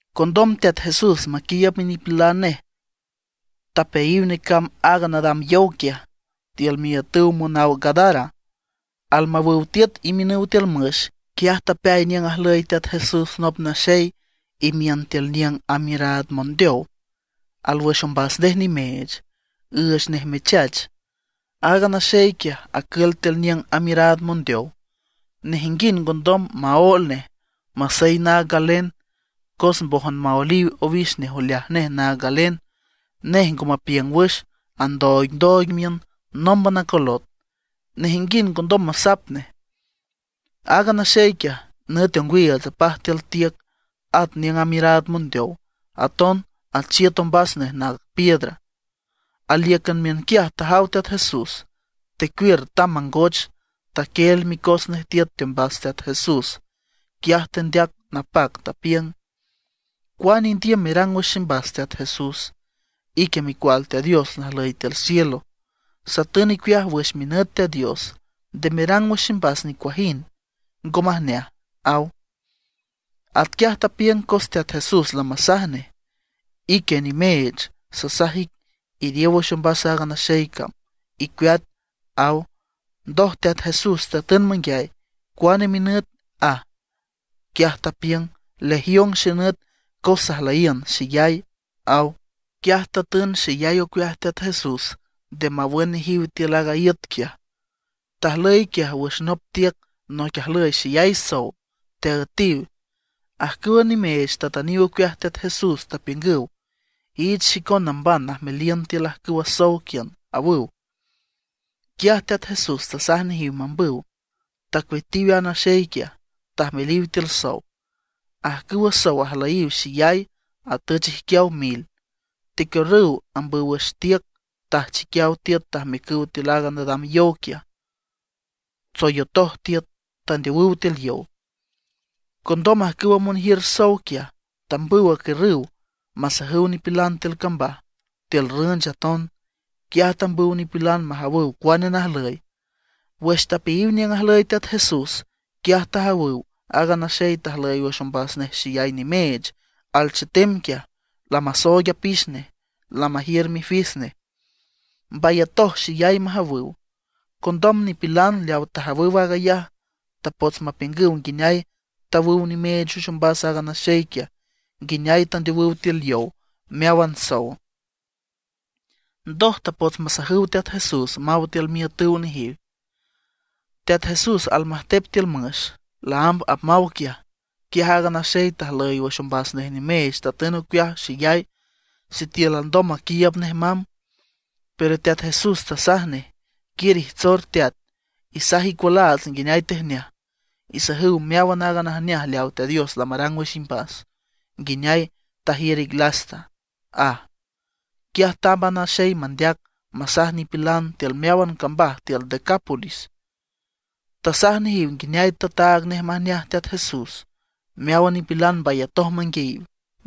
Condom Teat Jesús maquiiüb minipilan nej tapeayiw necamb aaga nadam yow quiaj, tiül miiütüw monaw Gadara. Almawüw tiüt imiünüw tiül müx, quiaj tapeay niüng ajlüy Teat Jesús nop naxey imiün tiül niüng amiüraad mondeow, alwüx ombas nej nimeech, üüch nej mechach Aaga naxey quiaj acül tiül niüng amiüraad mondeow. Nejinguind ngondom maóel nej, masey naag galen. Cos mbójan maoeliw owix nej oleaj nej naag galen. Nej ngo mapiüng wüx, andooigndooig miün, nómban acolot. Nejinguind ngondom masap nej. Aaga naxey quiaj, nüt ongwiiüts apaj tiül tiüc, at niüng amiüraad mondeow. Aton achiüt ombas nej naag piedra. Alíücan miünquiaj tajaw Teat Jesús, tecuiür tamb mangoch, taquieel micos nej tiüt teombas Teat Jesús. Quiaj tendeac napac, tapiüng: ―¿Cuane indiüm merang wüx ximbas Teat Jesús? Ique Micual Teat Dios najlüy tiül cielo. Satün icueaj wüx minüt Teat Dios, nde merang wüx ximbas nicuajind ngo majneaj ―aw. Atquiaj tapiüng cos Teat Jesús lamasaj nej: ―¡Ique nimeech, sasaj ic, iriow wüx ombas a naxey cam, icueat! ―aw. Ndoj Teat Jesús tatün manguiay: ―¿Cuane minüt? ―aj. Quiaj tapiüng: ―Legión xenüt cos sajlüyiün xeyay ―aw. Quiaj tatün xeyay ocueaj Teat Jesús nde mawün nejiw tiül aaga iüt quiaj. Tajlüy quiaj wüx nop tiüc noic ajlüy xeyay sow, teaüetiw. Ajcüwa nimeech tatüniw ocueaj Teat Jesús, tapiüngüw: ―Iich xicon namban najmeliün tiül ajcüwa sow quiün ―awüw. Quiaj Teat Jesús tasaj nejiw mambüw. Tacueatiw a naxey quiaj, tajmeliw tiül sow. Ajcüwa sow ajlüyiw xeyay, atüch ijquiaw mil, tecuiürrüw ambüw wüx tiüc tajchiquiaw tiüt tajmiücüw tiül aaga nadam yow quiaj, tsoyotoj tiüt, tandeowüw tiül yow. Condom ajcüwa monjiür sow quiaj, tambüw acuiürrüw masajüw nipilan tiül cambaj, tiül rünch aton. Quiaj tambüw nipilan majawüw cuane najlüy. Wüx tapeayiw niüng ajlüy Teat Jesús, quiaj tajawüw aaga naxey tajlüy wüx ombas nej xeyay nimeech alchetem quiaj, lamasooig apix nej, lamajiür mifis nej. Mbayatoj xeyay majawüw. Condom nipilan leawa tajawüw aag ayaj, tapots mapiüngüw nguineay tawüw nimeech wüx ombas aaga naxey quiaj, nguineay tandeowüw tiül yow meáwan sow. Ndoj tapots masajüw Teat Jesús maw tiül miiütüw nejiw. Teat Jesús almajtep tiül müx, laámb apmaw quiaj, quiaj aaga naxey tajlüy wüx ombas nej nimeech tatün ocueaj xeyay sitiül alndom maquiiüb nej mamb. Pero Teat Jesús tasaj nej: ―Quiür ijtsor teat, isaj icualaats nguineay tejneaj. Isajüw meáwan aaga najneaj leaw Teat Dios lamarang wüx imbas, nguineay tajiür ic lasta ―aj. Quiaj tamb a naxey mandeac, masaj nipilan tiül meáwan cambaj tiül Decápolis. Tasaj nejiw nguineay tataag nej majneaj Teat Jesús. Meáwan nipilan mbayatoj manguiayiw.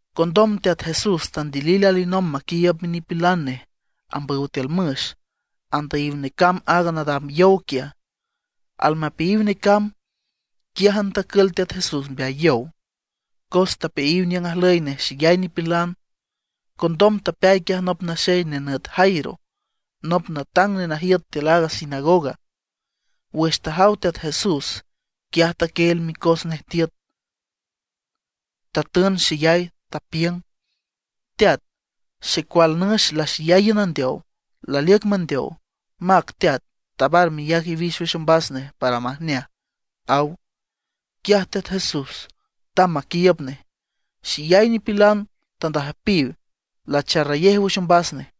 Condom Teat Jesús tandilil alinomb maquiiüb minipilan nej, ambüw tiül müx, andüyiw necamb aaga nadam yow quiaj. Almapeayiw necamb, quiájan tacül Teat Jesús mbeay yow, cos tapeayiw niüng ajlüy nej xeyay nipilan. Condom tapeay quiaj nop naxey nenüt Jairo, nop natang nenajiüt tiül a sinagoga; wüx tajaw Teat Jesús, quiaj taquieel micos nej tiüt. Tatün xeyay, tapiüng: ―Teat, xecual nüx laxeyay iün andeow, laliüc mandeow. Mac Teat, tabar meyac iwix wüx ombas nej para majneaj ―aw. Quiaj Teat Jesús tamb maquiiüb nej. Xeyay nipilan tandüjpiw, lacharrayej wüx ombas nej.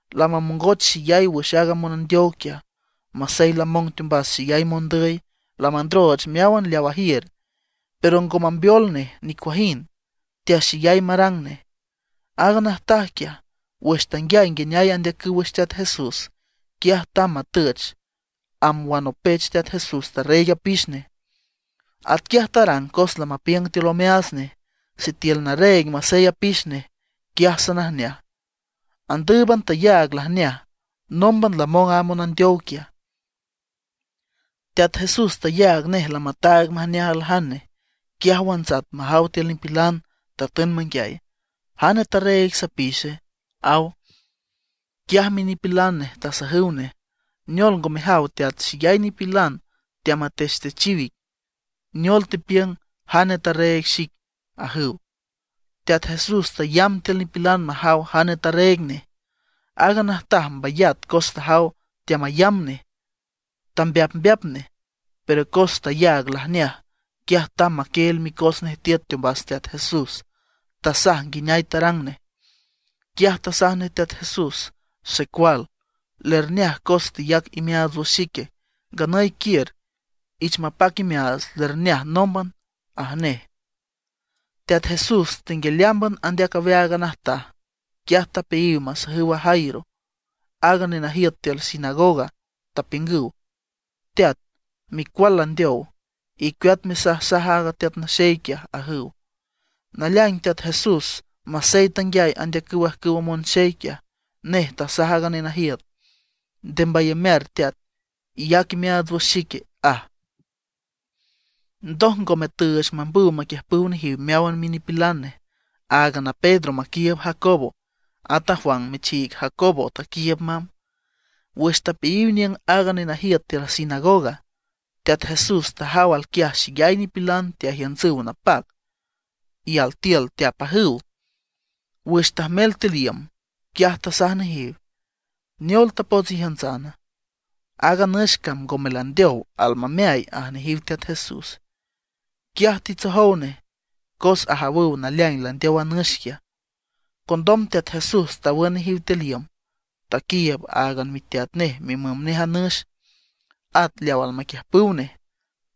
Lamamongoch xeyay wüx aaga monandeow quiaj. Masey lamong teombas xeyay mondüy, lamandrooch meáwan leaw ajiür, pero ngo mambeol nej nicuajind, teaxeyay marang nej. Aaga najtaj quiaj wüx tanguiay nguineay andeacüw wüx Teat Jesús, quiaj tamb matüch, amb wanopech Teat Jesús tarreeg apix nej. Atquiaj tarang, cos lamapiüng tiül omeaats nej: “Sitiül narreeg masey apix nej, quiaj sanajneaj”. Andǘüban tayaag lajneaj, nómban lamong a monandeow quiaj. Teat Jesús tayaag nej lamataag majneaj aljane, quiaj wantsat majaw tiül nipilan, tatün manguiay: ―¿Jane tarreeg sapixe? ―aw. Quiaj minipilan nej tasajüw nej: ―¿Neol ngo mejaw Teat, xeyay nipilan teamatechtechiw ic? Neol tepiüng: “¿Jane tarreeg xic?” ―ajüw. Teat Jesús tayamb tiül nipilan majaw jane tarreeg nej. Aaga najtaj mbayat cos tajaw teamayamb nej, tambeapmbeap nej. Pero cos tayaag lajneaj, quiaj tamb maquieel micos nej tiüt teombas Teat Jesús, tasaj nguineay tarang nej. Quiaj tasaj nej Teat Jesús: ―Xecual, lerjneaj cos teyac imeaats wüx xic. Nganüy quiür, ich mapac imeaats, lerjneaj nómban ―aj nej. Teat Jesús tenguialeámban andeac aweaag a najtaj, quiaj tapeayiw masajüw a Jairo, aaga nenajiüt tiül sinagoga, tapiüngüw: ―Teat, micual landeow, icueat mesajsaj aaga Teat Naxey quiaj ―ajüw. Naleaing Teat Jesús, masey tanguiay andeacüw ajcüwa monxey quiaj, nej tasaj aaga nenajiüt: ―Nde mbayamear teat, iyac imeaats wüx xique ―aj. Ndoj ngome tüüch mambüw maquiiüb nejiw meáwan minipilan nej, áagan a Pedro maquiiüb Jacobo, at a Juan michiig Jacobo taquiiüb mamb. Wüx tapeayiw aniüng aaga nenajiüt tiül sinagoga, Teat Jesús tajaw alquiaj xeyay nipilan teajiüntsüw napac, y altiül teapajüw. Wüx tajmel tiül iüm, quiaj tasaj nejiw: ―¿Neol tapots ijiüntsana? Aaga nüx cam ngome landeow, almameay ―aj nejiw Teat Jesús. Quiaj titsojow nej, cos ajawüw naleaing landeow a nüx quiaj. Condom Teat Jesús tawün nejiw tiül iüm, taquiiüb áagan miteat nej mimüm nej a nüx, at leaw almaquiüjpüw nej.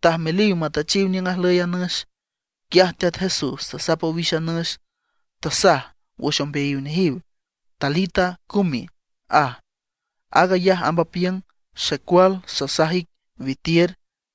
Tajmeliw matüchiw niüng ajlüy a nüx. Quiaj Teat Jesús tasap owix a nüx, tasaj wüx ombeayiw nejiw: ―Talita cumi ―aj. Aag ayaj amb apiüng: Xecual sasaj ic, witiür.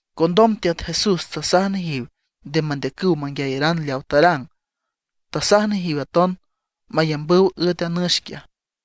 Condom Teat Jesús tasaj nejiw nde mandeacüw manguiayaran leawa tarang. Tasaj nejiw aton mayambüw üet a nüx quiaj.